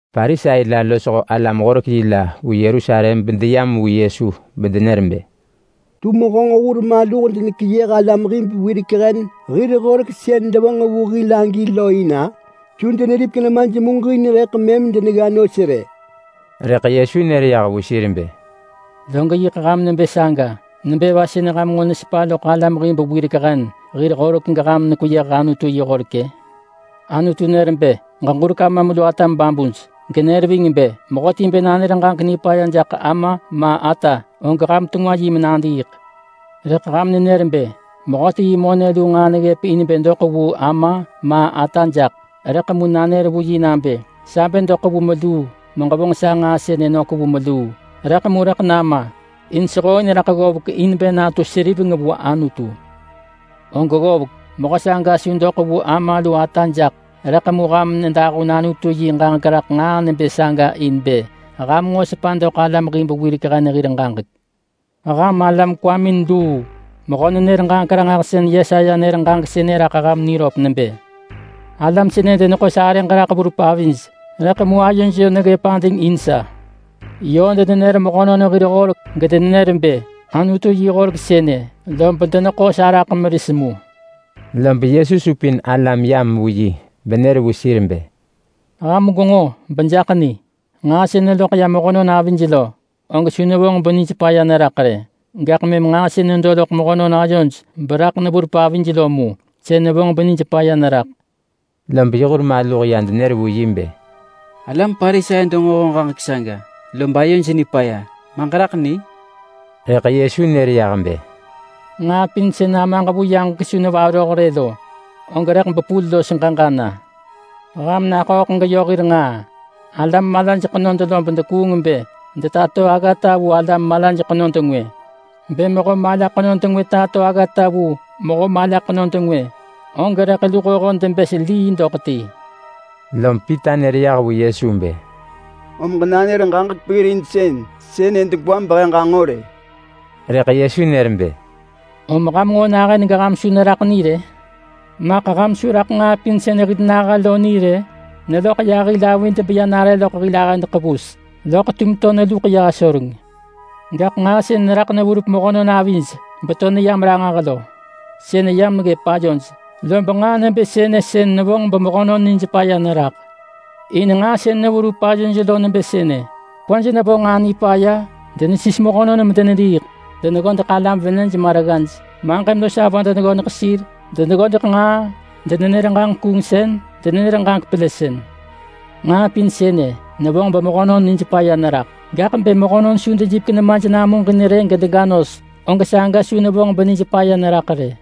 Parisai la losho alam-horek-yi la vu Yerusalem bedeyam vu Yesu bedenër bë, “Tum honġ hur maluh denekeyëh alam hib wirek hen hir horek sën devonġ vu hil agi lo in-a? Su deneripek nemaj muġin rëḳ mëm denegga nos rë!” Rëḳ Yesu nër yah vu sir bë, “Log yiḳ ham nebë saga! Nebë va sën ham nġo nesepa loḳ alam hib wirek hen hir horek geham nekweyëh Anutu yi horek-ë? Anutu nër bë, ‘Ġeġurek amam lu atam babuj’ genër ving bë, ‘Mehöti bë nanër ġaġek nipaya jaḳ ama ma ata, og ham tengwa yi menadiiḳ’. Rëḳ ham nenër bë, ‘Mehöti yi monë lu nġaa neggëp in bë doḳ vu ama ma ata jaḳ, rëḳ mu nanër vu yi nabë, “Sa bë doḳ vu meluu meġevonġ sa nġaa sënë nök vu meluu, rëḳ mu rëḳ nama, in sehooin raḳ ggovek in bë natu seriveng vu Anutu”, og ggovek, mehö saga su doḳ vu ama lu ata jaḳ.’ Rëḳ mu ham nedahun Anutu yi ġaġek raḳ nġaa nebë saga in bë ham nġo sepa doḳ alam hib wirek hen hir ġaġek. Ham alam kwamin luu! Mehö-nenër-ġaġek-ranġahsën Yesaya nër ġaġek sënë raḳ ham niröp nebë: ‘Alam sënë deneḳo sarëġ raḳ verup avij, rëḳ mu ayoj yö neggëp ading in sa. Yö denenër mehönon hir horek gedenenër bë, “Anutu yi horek sënë!” lob deneḳo sa raḳ meris mu.’” Lob Yesu supin alam deyam vu yi benër vu sir bë, “Ham gwenġo beham jaḳ ni. Nġaa sën neloḳ ya mehönon avij lo, og su nevonġ benij paya neraḳ rë. Gaḳ mëm nġaa sën nedo loḳ mehönon ayoj beraḳ neverup avij lo mu, sën nevonġ benij paya neraḳ.” Lob yi hur maluh ya denër vu yi bë, “Alam Parisai denġo honġ ġaġek saga lob ayoj nipaya. Ma ġeraḳ ni?” Rëḳ Yesu nër yah bë, “Nġaa pin sën Amaġ vu yaġek su nevaroh rë lo, og rëḳ bepul los ġeġa na. Ham naḳööḳ geyö hir nġaa! Alam malaj ḳenod lob dekuung bë detato aggata vu alam malaj ḳenod ngwë. Bë mehö mala ḳenod ngwë tato aggata vu mehö mala ḳenod ngwë, og rëḳ luhoho debës lii doḳ ti.” Lom Pita nër yah vu Yesu bë, “Om ġenanër ġaġek peggirinsën sënë degwa behe ġanġo rë!” Rëḳ Yesu nër bë, “Om ham nġo nahën geham su neraḳ ni rë? Maḳ ham su raḳ nġaa pin sën hil naha lo ni bë neloḳ ya hil avid beya nare loḳ hil ahëd ḳevus, loḳ tum to neluḳ ya asoreng rë? Gaḳ nġaa sën raḳ neverup mehönon avij beto neyam ranġah lo, sën yam ggëp ayoj. Lob nġaa nebë sënë sën nevonġ bemehönon nij paya neraḳ. In nġaa sën neverup ayoj lo nebë sënë: Kwaj nevo nġaa nipaya, denesis mehönon medenediiḳ, deneggodeḳ alam venëj ma reggaj, maġëm los avö deneggodeḳ sir, deneggodeḳ nġaa, denenër ġaġek kuungsën, denenër ġaġek pelësën. Nġaa pin sënë nevonġ bemehönon nij paya neraḳ. Gaḳ bë mehönon dega nos besu dejipek nemaj namuġin rë, og saga su nevonġ benij paya neraḳ rë.”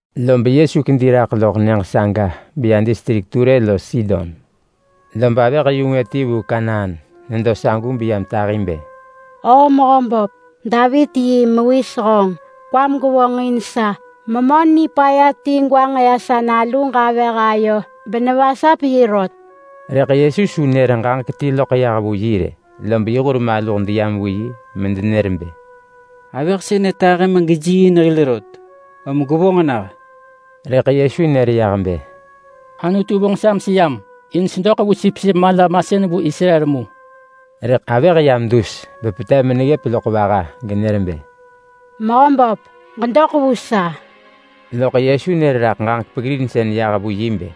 Lob Yesu kedi raḳ loḳ nyëġ saga beya distrik Ture los Sidon. Lob avëh-yu-ngwë ti vu Kanaan nedo sagu beyam tahi bë, “O Mehöböp! Davit yi Mewis honġ! Kwam gevonġ in sa! Memö nipaya ti gwanġ ya sa naluġ avëh ayo benevasap yi rot!” Rëḳ Yesu su nër ġaġek ti loḳ yah vu yi rë. Lob yi hur maluh deyam vu yi medenër bë, “Avëh sënë tahi megejiiin hil rot, om gwevonġ nah!” Rëḳ Yesu nër yah bë, “Anutu vonġ sa meseyam in sedoḳ vu sipsip mala-masën vu Israel mu!” Rëḳ avëh yam dus bepetev meneggëp loḳ vaha genër bë, “Mehöböp ġedoḳ vu sa!” Loḳ Yesu nër raḳ ġaġek peggirinsën yah vu yi bë,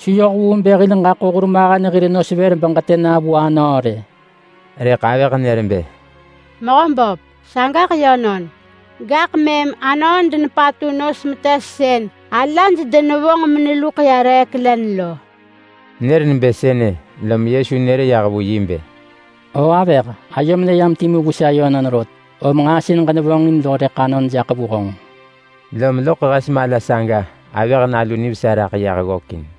“Su yoh vu bë hil ġaḳo hurmahen hir nos vër beġetë na vu anöö rë!” Rëḳ avëh nër bë, “Mehöböp, sagaḳ yönon, gaḳ mëm anöö denepatu nos metes sën alaj denevonġ meneluḳ ya reek len lo!” Nër nebë sënë, lom Yesu nër yah vu yi bë, “O avëh! Ayom neyam timu vu sa yönon rot, om nġaa sën ġenevonġin lo rëḳ anon jaḳ vu honġ.” Lom loḳ hes mala saga avëh nalu nivesa raḳ yah ggökin.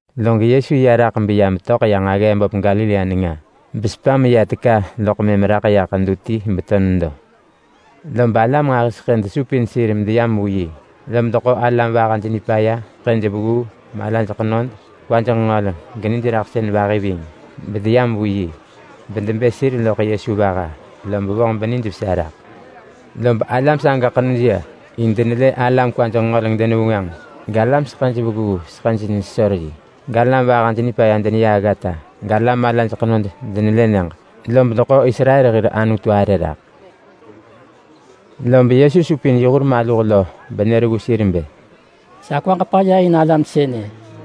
Log Yesu ya raḳ beya metöḳ ya nġaggee böp Galilea nenga. Besepa meya teka loḳ mëm raḳ ya ḳedu ti beto nedo. Lob alam nġahiseḳë desupin sir medeyam vu yi. Lob deḳo alam vahaj nipaya, seḳëj vegguu, malaj ḳenod, kwaj nġengöleng, geniraḳsën vahi ving, bedeyam vu yi. Bedebë sir loḳ Yesu vaha, lob vonġ benijvesa raḳ. Lob alam saga ḳenuj ya in denelë alam kwaj nġengöleng denevengwënġ, galam seḳëj vegguu seḳëj nesesor yi, galam vahaj nipaya deneya aggata, galam malaj ḳenod denelë nyëġ. Lob deḳo Israel hir Anutu arë raḳ. Lob Yesu supin yi hur maluh lo benër vu sir bë, “Sa kwaġ paya in alam sënë,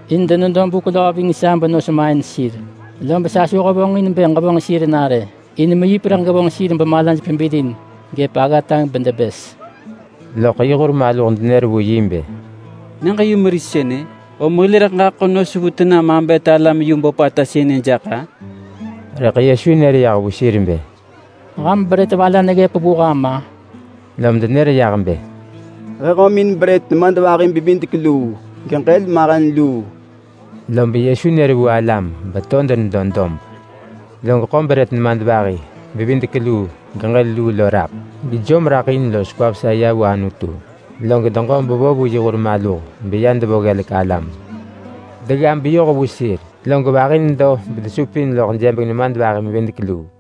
in denedo buk löö ving sa benos main sir. Lob sa su hevonġin bë ġevonġ sir na rë, in meyip rëḳ gevonġ sir bemalaj pebilin gëp aggata bedebës.” Loḳ yi hur maluh denër vu yi bë, “Nyëġ-yumeris sënë, om hil rëḳ ġaḳo nos vu tena mabet alam yu böpata sënë jaḳ-a?” Rëḳ Yesu nër yah vu sir bë, “Ham brët va la neggëp vu ham-a?” Lom denër yah bë, “He hömin brët nemadvahi-bevidek-luu geġël mahen luu.” Lob Yesu nër vu alam beto denedo dob. Log ḳo brët nemadvahi-bevidek-luu, geġël luu lo raḳ, gejom raḳ in los kwa vesa ya vu Anutu, log deġo bevo vu yi hur maluh, beya devo ggelek alam. Degga beyoh vu sir, log vahi nedo bedesupin loḳ jebeng nemadvahi-mevidek-luu.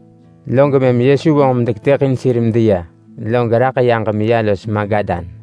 Log mëm Yesu vonġ medeketëḳin sir medeya, log raḳ yaġ meya los Magadan.